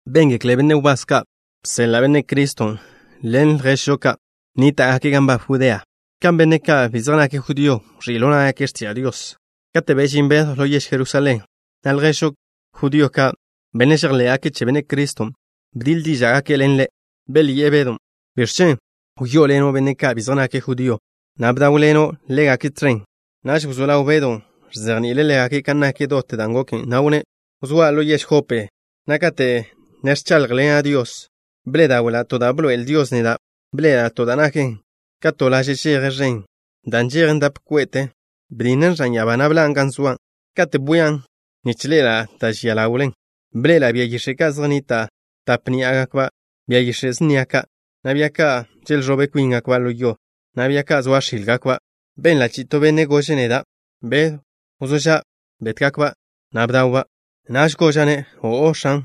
Béngekle benne' wbás ka' bseḻa' Benne' Criston' ḻen lježžo ka' nníta'gake' gan nbab Judea, kan benne' ka' bi zej nake' judío wẕí' ḻo ná'gake' x̱tiža' Dios. Kate' bežín Bedw ḻo yež Jerusalén, na' lježžo judío ka', benne' žejḻé'gake' che Benne' Criston', bdiḻ díža'gake' ḻen ḻe'. Belyi'e Bedon': —¿Biẕ chen' wyó'oḻeno' benne' ka' bi zej nake' judío, na' bdáwḻeno' ḻégake' tẕen? Naž wzó ḻaw Bedon' ẕzejni'ile' ḻégake' kan nak dot dan' goken, na' wnné': —Wzóa' ḻo yež Jope, na' kate' ne ẕcháḻjḻena' Dios, bḻe'e dáwe'la' to da' bḻoe'el Dios neda'. Bḻe'ela' to da' naken ka to laže' žeje ẕen, dan' nžejen dap kwe'te. Betjen ẕan ya'abá, na' bžinen gan zoa'. Katen' bwian', nich ḻe'ela' da' žian ḻawlen, bḻe'ela' bia yix̱e' ka' zej nnita' tape ni'a ná'gakba', bia yix̱e' snia ka', na' bia ka' želẕobe kwíngakba' ḻo yo, na' bia ka' zoa x̱ílgakba'. Benla' chi'i to benne' gože' neda': “Bedw, wzó ža'. Bet-ba', na' bdaw-ba'.” Naž goža'-ne': “O'o, X̱an.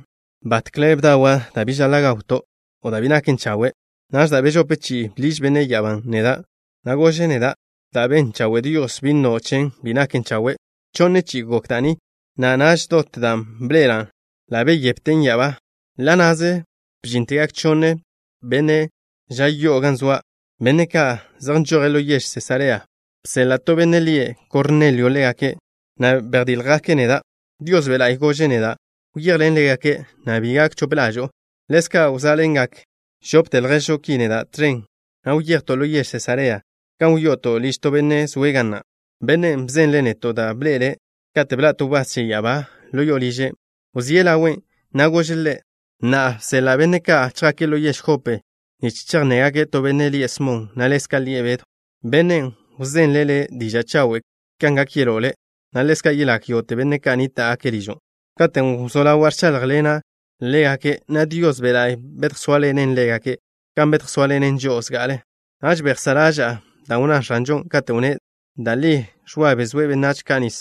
Batkle bdawa' da' bi žaḻa' gawto', o da' bi naken chawe'.” Naž da' bežope chi'i bḻiž benne' ya'abán' neda', na' gože' neda': “Da' ben chawe' Dios, bi nno' chen: bi naken chawe'.” Chonne chi'i gok da' ni, na' naž dot dan' bḻe'ela' ḻa' beyepten ya'abá. Ḻa' na'ze bžíntegak chonne benne' ža yo'o gan zoa', benne' ka' zej nžoje' ḻo yež Sesarea. Bseḻa' to benne' lie' Kornelio ḻégake', na' bedjdíljgake' neda'. Dios Be' La'y gože' neda': “Wyejḻen ḻégake', na' bi gak chope ḻažo'o.” Ḻezka' wzá'ḻengak žopte lježžo ki neda' tẕen, na' wyejto' ḻo yež Sesarea gan wyo'oto' liž to benne' zoe' ga na'. Bennen' bzenle' neto' da' bḻe'ele' kate' bḻa' to wbás che ya'abá ḻo liže'. Wzíe' ḻawe', na' gože' ḻe': “Na'a bseḻa' benne' ka' chjake' ḻo yež Jope, nich chejnnégake' to benne' lie' Smon, na' ḻezka' lie' Bedw. Bennen' wzenle' le' diža' chawen' kan gak yeló' le', na' ḻezka' yelagak yógo'te benne' ka' nníta'gake' ližo'.” Katen' wzó ḻawa' ẕcháḻjḻena' ḻégake', na' Dios Be' La'y bedjsóaḻene' ḻégake' kan bedjsóaḻene' žo'o zga'ale. Naž bejsá' ḻaža'a da' wnná X̱anžon', katen' wnné': “Da' li Ẕwa bezóe' benách ka' nis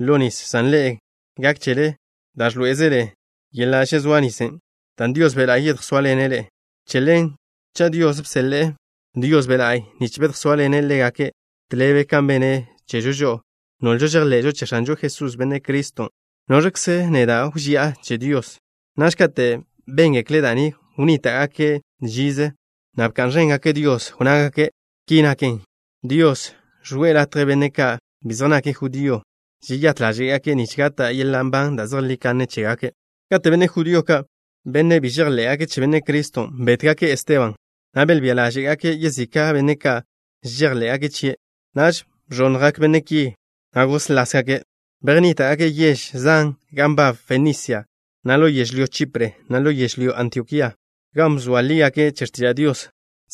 ḻo nis, san ḻe'e, gak chele da' ẕḻoé'ezele yeḻa' žezóa nisen', dan' Dios Be' La'y yedjsóaḻene' ḻe'e.” Che ḻen, cha' Dios bseḻe'e Dios Be' La'y nich bedjsóaḻene' ḻégake', tḻebe kan bene' chežo žo'o, nolžo žejḻe'žo che X̱anžo Jesús, Benne' Criston', ¿noẕkze neda' wži'a che Dios? Naž, kate' béngekle' da' ni wnníta'gake' žize, na' bka'n ẕéngake' Dios. Wnnágake': —Ki naken, Dios žwe'e latje benne' ka' bi zej nake' judío, žeyát ḻáže'gake' nich gata' yeḻa' nban da' zejlí kanne chégake'. Katen' benne' judío ka', benne' bi žejḻé'gake' che Benne' Criston', bétgake' Esteban, na' belbía ḻáže'gake' yezika' benne' ka' žejḻé'gake' chie', naž bẕonnjgak benne' ki, na' góslasgake'. Bejnníta'gake' yež zan gan nbab Fenisia, na' ḻo yežlyó Chipre, na' ḻo yež Antiokía, gan bzoa lígake' che x̱tiža' Dios,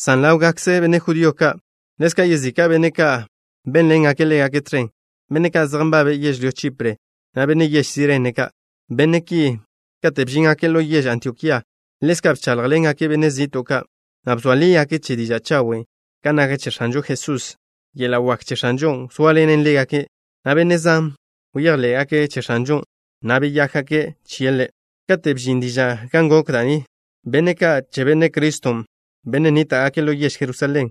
san ḻáwgakze benne' judío ka'. Ḻezka' yezika' benne' ka' bénḻengake' ḻégake' tẕen, benne' ka' zej nbabe' yežlyó Chipre, na' benne' yež Sirene ka'. Benne' ki, kate' bžíngake' ḻo yež Antiokía, ḻezka' bcháḻjḻengake' benne' zi'to' ka', na' bzoa lígake' che diža' chawen' kan nak che X̱anžo Jesús. Yeḻa' wak che X̱anžon' wzóaḻenen ḻégake', na' benne' zan bejḻé'gake' che X̱anžon', na' beyákgake' chie' Ḻe'. Kate' bžin diža' kan gok da' ni, benne' ka' che Benne' Criston', benne' nníta'gake' ḻo yež Jerusalén,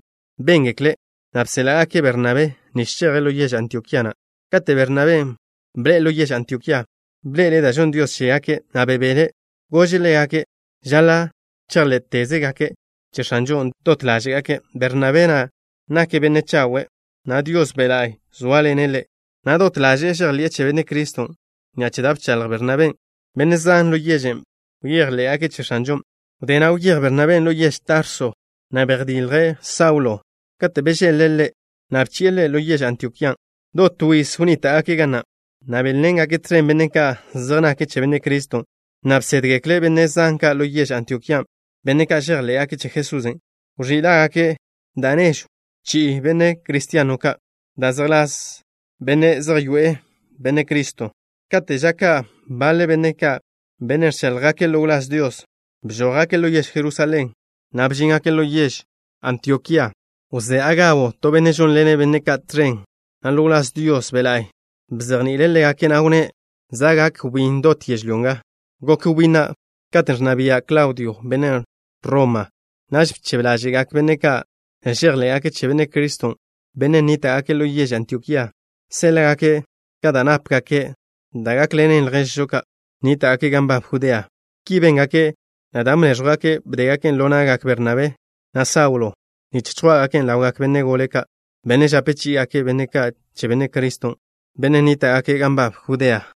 béngeklen', na' bséḻa'gake' Bernabé nich cheje' ḻo yež Antiokía na'. Kate' Bernabén' bḻe'e ḻo yež Antiokía, bḻe'ele' da' žonn Dios chégake', na' bebele'. Goze' ḻégake' žaḻa' chejḻé'tezgake' che X̱anžon' dot ḻáže'gake'. Bernabén' nake' benne' chawe', na' Dios Be' La'y zóaḻene' ḻe', na' dot ḻaže'e žejḻi'e che Benne' Criston'. Ni'a che da' bchaḻj Bernabén', benne' zan ḻo yežen' bejḻé'gake' che X̱anžon'. Wdé na', wyéj Bernabén' ḻo yež Tarso, na' bejdilje' Saulo. Kate' bežeḻ-le'-ne', bchi'e ḻe' ḻo yež Antiokían'. Dot to yiz wnníta'gake' ga na', na' bénḻengake' tẕen benne' ka' zej nake' che Benne' Criston', na' bsédgekle' benne' zan ka'. Ḻo yež Antiokían', benne' ka' žejḻé'gake' che Jesusen' wẕí lágake' da' nežw chi'i Benne' Cristiano ka', da' zejḻás Benne' Zej Yoe'e Benne' Criston'. Kate' ža ka' baḻe benne' ka', benne' ẕcháḻjgake' ḻo wláz Dios, bžójgake' ḻo yež Jerusalén, na' bžíngake' ḻo yež Antiokían'. Wzé Agabo, to benne' žónḻene' benne' ka' tẕen, na' ḻo wláz Dios Be' La'y bzejni'ile' ḻégake', na' wnné': —Za' gak wbín dot yežlyó nga. Gok wbín na' katen' ẕnna bia' Klaudio, benne' Roma. Naž bchebe ḻáže'gak benne' ka' žejḻé'gake' che Benne' Criston', benne' nníta'gake' ḻo yež Antiokía, séḻa'gake' ka da' nápegake', da' gákḻenen lježžo ka' nníta'gake' gan nbab Judea. Ki béngake', na' dan' bnéẕjwgake', bdégaken' ḻo na'gak Bernabén', na' Saulon' nich chjwá'gaken' ḻawgak benne' gole ka', benne' žape chí'igake' benne' ka' che Benne' Criston', benne' nníta'gake' gan nbab Judea.